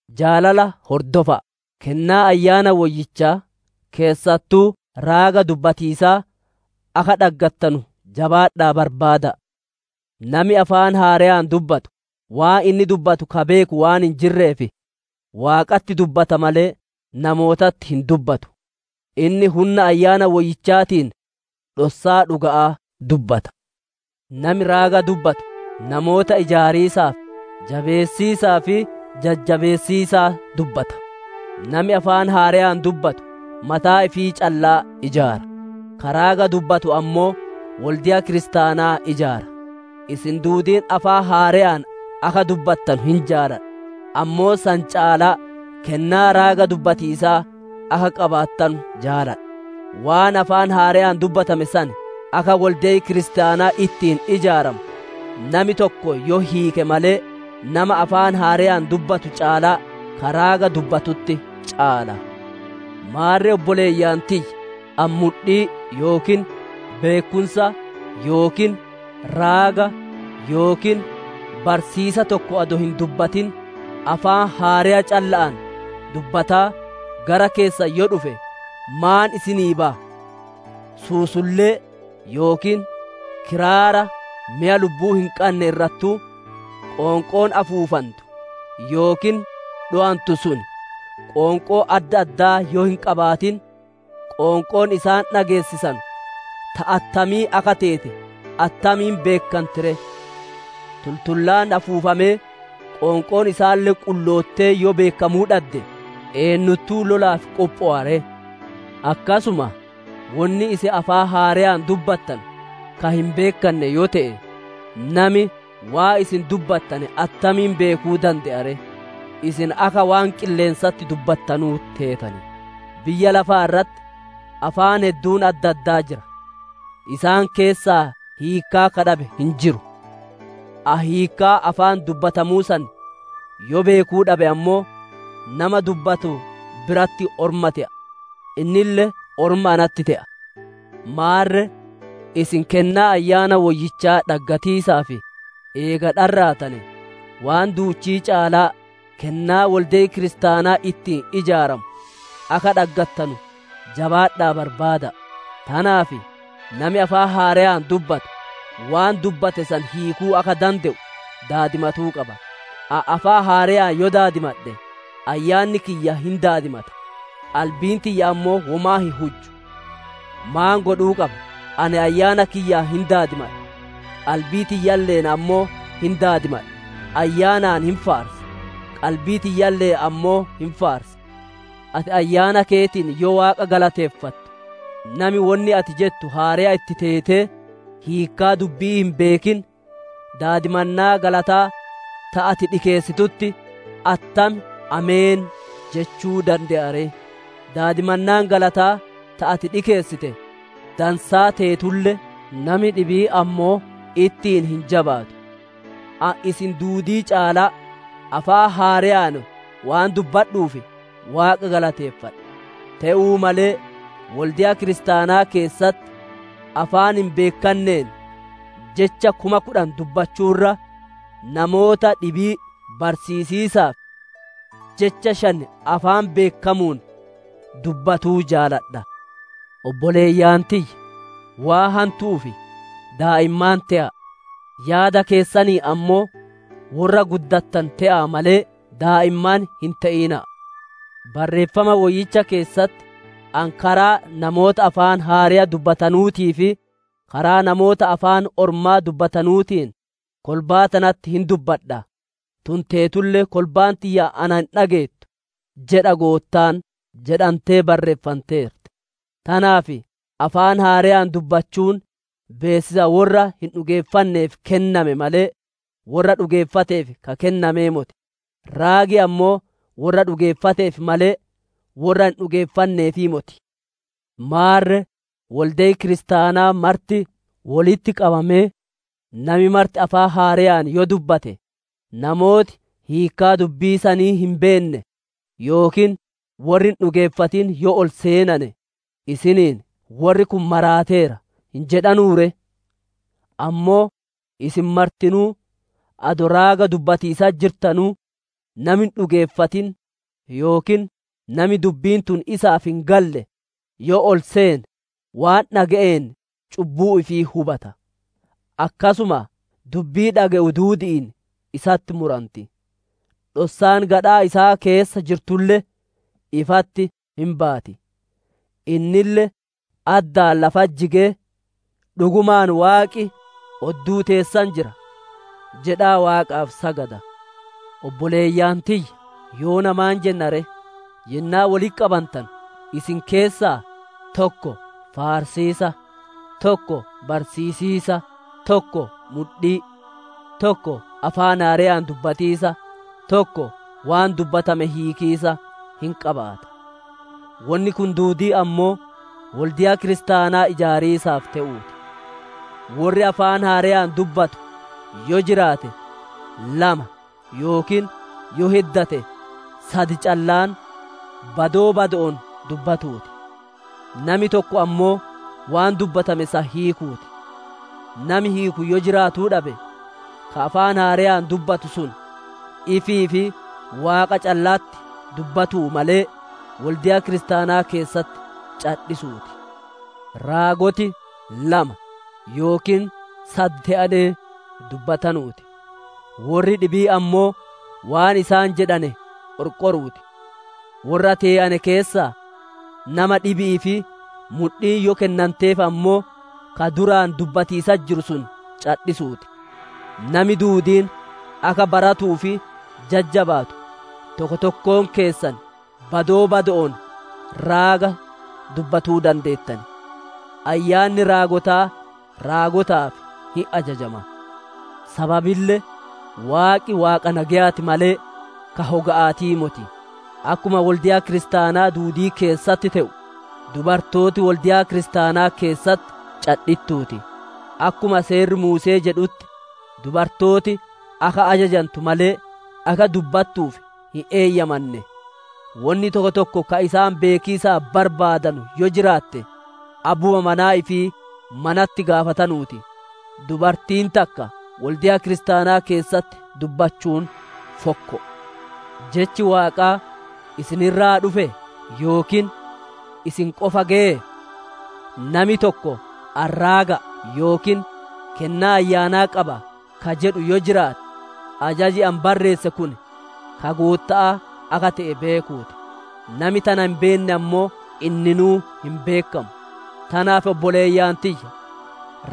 Jaalala hordofa'a; kennaa Ayyaana Woyyichaa, keessattuu raaga dubbatiisaa akka dhaggattanu jabaadha'aa barbaada'a. Nami afaan haareeyaan dubbatu, waan inni dubbatu ka beeku waan hin jirreef, Waaqatti dubbata malee namootatti hin dubbatu; inni hunna Ayyaana Woyyichaatiin dhossaa dhuga'aa dubbata. Nami raaga dubbatu, namoota ijaariisaaf, jabeessiisaa fi jajjabeessiisaa dubbata. Nami afaan haareyaan dubbatu mataa ifii callaa ijaara; ka raaga dubbatu ammoo wolde'a kiristaanaa ijaara. Isin duudiin afaan haareyaan akka dubbattanu hin jaaladha; ammoo san caalaa kennaa raaga dubbatiisaa akka qabaattanu jaaladha. Waan afaan haareyaan dubbatame san, akka wolde'i kiristaanaa ittiin ijaaramu nami tokko yoo hiike malee, nama afaan haareyaan dubbatu caalaa ka raaga dubbatutti caala. Maarre obboleeyyan tiyya! Ani mudhii yookiin beekkumsa yookiin raaga yookiin barsiisa tokko adoo hin dubbatin, afaan haareya calla'aan dubbataa gara keessan yoo dhufe, maan isinii baya? Suusullee yookiin kiraara meya lubbuu hin qanne irrattuu, qoonqoon afuufantu yookiin dhowantu sun qoonqoo adda addaa yoo hin qabaatin, qoonqoon isaan dhageessisanu ta attamii akka teete attamiin beekkanti ree? Tultullaan afuufamee, qoonqoon isaalle qulloottee yoo beekkamuu dhadde, eennuttuu lolaaf qophowa ree? Akkasuma, wonni isin afaan haareyaan dubbattanu ka hin beekkanne yoo te'e, nami waan isin dubbattane attamiin beekuu dande'a ree? Isin akka waan qilleensatti dubbattanuu teetan. Biyya lafaa irratti afaan hedduun adda addaa jira; isaan keessaa hiikkaa ka dhabe hin jiru. Ani hiikkaa afaan dubbatamuu san yoo beekuu dhabe ammoo, nama dubbatu biratti orma te'a; innille orma natti te'a. Maarre isin kennaa Ayyaana Woyyichaa dhaggatiisaaf eega dharraatane, waan duuchii caalaa kennaa wolde'i kiristaanaa ittiin ijaaramu akka dhaggattanu jabaadha'aa barbaada'a. Tanaaf nami afaan haareyaan dubbatu, waan dubbate san hiikuu akka dande'u daadimatuu qaba. Ani afaan haareyaan yoo daadimadhe, ayyaanni kiyya hin daadimata; qalbiin tiyya ammoo womaa hin hujju. Maan godhuu qaba? Ani ayyaana kiyyaan hin daadimadha; qalbii tiyyaalle'een ammoo hin daadimadha; ayyaanaan hin faarsa; qalbii tiyyalle'een ammoo hin faarsa. Ati ayyaana keetiin yoo Waaqa galateeffattu, nami wonni ati jettu haareya itti teetee, hiikkaa dubbi'ii hin beekin, daadimannaa galataa ta ati dhikeessitutti, «Attam Ameen» jechuu dande'a ree? Daadimannaan galataa ta ati dhikeessite dansaa teetulle, nami dhibiin ammoo ittiin hin jabaatu. Ani isin duudii caalaa afaan haareyaan waan dubbadhuuf, Waaqa galateeffadha. Te'uu malee wolde'a kiristaanaa keessatti, afaan hin beekkanneen jecha kuma kudhan dubbachuu irra, namoota dhibii barsiisiisaaf, jecha shan afaan beekkamuun dubbatuu jaaladha. Obboleeyyan tiyya! Waan hantu'uuf daa'immaan te'a'a; yaada keessaniin ammoo worra guddatane te'aa malee, daa'immaan hin te'ina'a. Barreeffama Woyyicha keessatti, «‹Ani karaa namoota afaan haareya dubbatanuutii fi karaa namoota afaan ormaa dubbatanuutiin, kolbaa tanatti hin dubbadha; tun teetulle kolbaan tiyya ana hin dhageettu› jedha Goottaan» jedhantee barreenfanteerti. Tanaaf afaan haareyaan dubbachuun beessisa worra hin dhugeeffanneef kenname malee, worra dhugeeffateef ka kennamee moti; raagi ammoo worra dhugeeffateef malee, worra hin dhugeeffanneefii moti. Maarre wolde'i kiristaanaa marti wolitti qabamee, nami marti afaan haareyaan yoo dubbate, namooti hiikkaa dubbii sanii hin beenne yookiin worri hin dhugeeffatin yoo ol seenane isiniin, «Worri kun maraateera» hin jedhanuu ree? Ammoo isin martinuu adoo raaga dubbatiisatti jirtanuu, nami hin dhugeeffatin yookiin nami dubbiin tun isaaf hin galle yoo ol seene, waan dhage'een cubbuu ifii hubata. Akkasuma dubbii dhage'u duudi'iin isatti muranti. Dhossaan gadhaa isaa keessa jirtulle ifatti hin baati; innille addaan lafatti jigee, «Dhugumaan Waaqi odduu teessan jira» jedhaa Waaqaaf sagada. Obboleeyyan tiyya! Yoona maan jenna ree? Yennaa wolitti qabantanu isin keessaa tokko faarsiisa, tokko barsiisiisa, tokko mudhii, tokko afaan haareyaan dubbatiisa, tokko waan dubbatame hiikiisa hin qabaata. Wonni kun duudiin ammoo, wolde'a kiristaanaa ijaariisaaf te'uu ti. Worri afaan haareyaan dubbatu yoo jiraate, lama yookiin yoo heddate sad callaan, badoo bado'oon dubbatuu ti; nami tokko ammoo waan dubbatame san hiikuu ti. Nami hiiku yoo jiraatuu dhabe, ka afaan haareyaan dubbatu sun, ifii fi Waaqa calla'atti dubbatuu malee, wolde'a kiristaanaa keessatti cadhisuu ti. Raagoti lama yookiin sad te'anee dubbatanuu ti; worri dhibiin ammoo waan isaan jedhane qorqoruu ti. Worra tee'ane keessaa nama dhibi'iif mudhiin yoo kennanteef ammoo, ka duraan dubbatiisatti jiru sun cadhisuu ti. Nami duudiin akka baratuu fi jajjabaatu, tokko tokkoon keessan badoo bado'oon raaga dubbatuu dandeettan. Ayyaanni raagotaa raagotaaf hin ajajama. Sababille Waaqi Waaqa nageyaa ti malee, ka hoga'aatii moti. Akkuma wolde'a kiristaanaa duudii keessatti te'u, dubartooti wolde'a Kiristaanaa keessatti cadhittuu ti. Akkuma Seerri Muuse'ee jedhutti, dubartooti akka ajajantu malee, akka dubbattuuf hin eeyyamanne. Wonni tokko tokko ka isaan beekiisaa barbaadanu yoo jiraatte, abbuma manaa ifii manatti gaafatanuu ti; dubartiin takka wolde'a Kiristaanaa keessatti dubbachuun fokko'o. Jechi Waaqaa isin irraa dhufee? Yookiin isin qofa geyee? Nami tokko ani raaga'a yookiin kennaa ayyaanaa qaba ka jedhu yoo jiraate, ajaji ani barreesse kun ka Gootta'aa akka te'e beekuu ti. Nami tana hin beenne ammoo, inninuu hin beekkamu. Tanaaf obboleeyyan tiyya!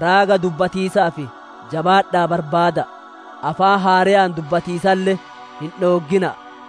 Raaga dubbatiisaaf jabaadha'aa barbaada'a; afaan haareyaan dubbatiisalle hin dhooggina'a.